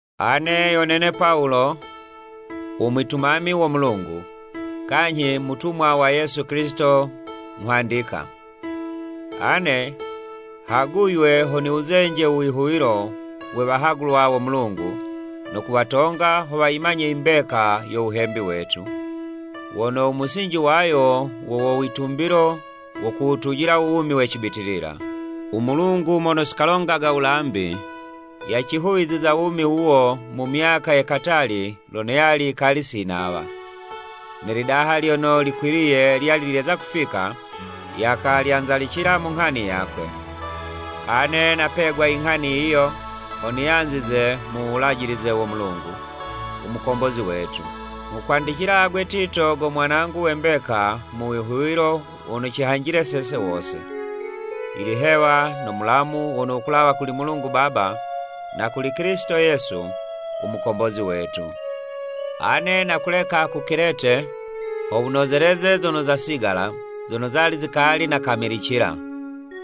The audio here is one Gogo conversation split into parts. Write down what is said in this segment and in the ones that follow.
Ane yo nene Pawulo, u mwitumami wo Mulungu, kanyhi mutumwa wa Yesu Kilisito nghwandika. Ane haguywe ho niwuzenje u wihuwilo we wahagulwa wo Mulungu no kuwatonga ho wayimanye i mbeka yo wuhembi wetu, wono u musinji wayo wo wowitumbilo wo kuwutujila u wumi we cibitilila. U Mulungu mono si kalongaga wulambi, yacihuwiziza u wumi wuwo mu myaka ye katali lono yali yikali si nawa, ne lidaha lyono likwiliye lyali lyeza kufika, yakalyanzalicila mu nghani yakwe. Ane napegwa i nghani yiyo, ho niyanzize mu wulajilize wo Mulungu, u Mukombozi wetu. Nghukwandicila agwe Tito go mwanangu we mbeka mu wihuwilo wono cihanjile sese wose. Ilihewa no mulamu wono wukulawa kuli Mulungu Baba, na kuli Kilisito Yesu, u Mukombozi wetu. Ane nakuleka ku Kilete ho wunozeleze zono zasigala zono zali zikali nakamilicila,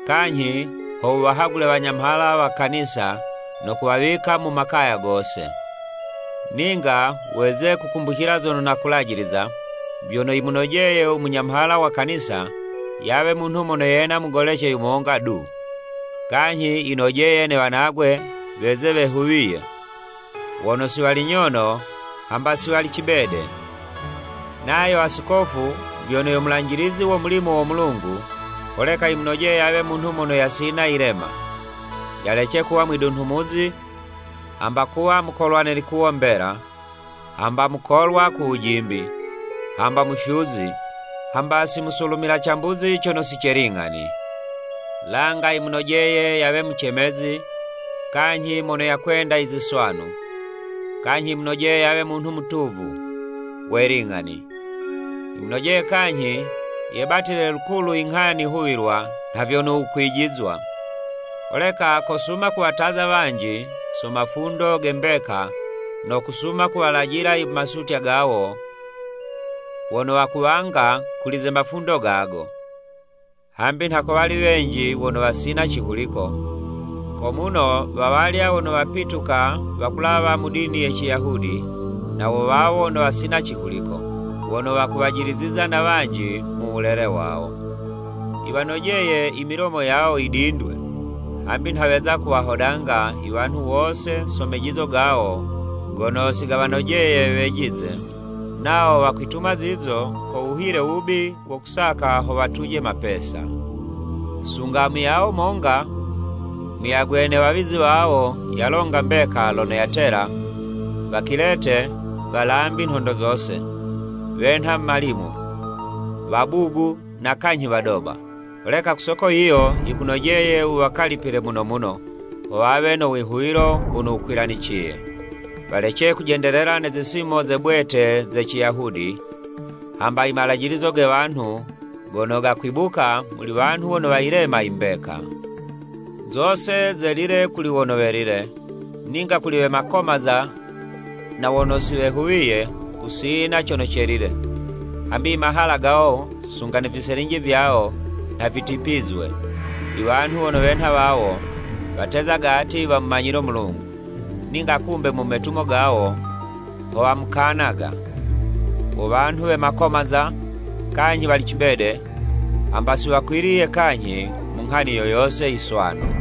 kanyhi ho wuwahagule wanyamhala wa Kanisa no kuwawika mu makaya gose. Ninga weze kukumbucila zono nakulajiliza, vyono yimunojeye u munyamhala wa Kanisa yawe munhu mono yena mugolece yumonga du, kanyhi yinojeye ne wanagwe weze wehuwiye, wono si wali nyono hamba si wali cibede. Nayo Asikofu vyono yo mulanjilizi wo mulimo wo Mulungu, holeka yimunojeye yawe munhu mono yasina yilema. Yalece kuwa mwidunhumuzi, hamba kuwa mukolwa ne likuwo mbela, hamba mukolwa ku wujimbi, hamba mufyuzi, hamba si musulumila cambuzi cono si ce ling'ani. Langa yimunojeye yawe mucemezi, kanyhi mono yakwenda iziswanu. Kanyhi yimunojeye yawe munhu mutuvu, we ling'ani. Yimunojeye kanyhi, yebatile lukulu i nghani huwilwa nha vyono wukwijizwa. Holeka kosuma kuwataza wanji so mafundo ge mbeka no kusuma kuwalajila i masutya gawo wono wakuwanga kuli ze mafundo gago. Hambi nha ko wali wenji wono wasina cihuliko, ko muno wa walya wono wapituka wakulawa mu dini ye Ciyahudi na wo wawo wono wasina cihuliko, wono wakuwajiliziza na wanji mu wulele wawo. Yiwanojeye i milomo yawo yidindwe, hambi nha weza kuwahodanga i wanhu wose so mejizo gawo gono si gawanojeye wejize, nawo wakwituma zizo ko wuhile wubi wo kusaka ho watuje mapesa. Sunga muyawo monga; muyagwe ne wawizi wawo yalonga mbeka lono yatela, “Wakilete walambi nhondo zose, wenha malimu, wabugu na kanyhi wadoba!” Holeka ku soko yiyo yikunojeye wuwakalipile muno muno, ho wawe no wihuwilo wono wukwilaniciye. Walece kujendelela ne zisimo ze bwete ze Ciyahudi, hamba i malajilizo ge wanhu gono gakwibuka muli wanhu wono wayilema i mbeka. Zose zelile kuli wono welile, ninga kuli we makomaza na wono si wehuwiye, kusina cono celile, hambi i mahala gawo sunga ne viselinji vyawo nha vitipizwe. I wanhu wono wenha wawo, watezaga ati wamumanyile u Mulungu, ninga kumbe mu metumo gawo ho wamukanaga. Wo wanhu we makomaza, kanyhi wali cibede, hamba si wakwiliye kanyhi mu nghani yo yose i swanu.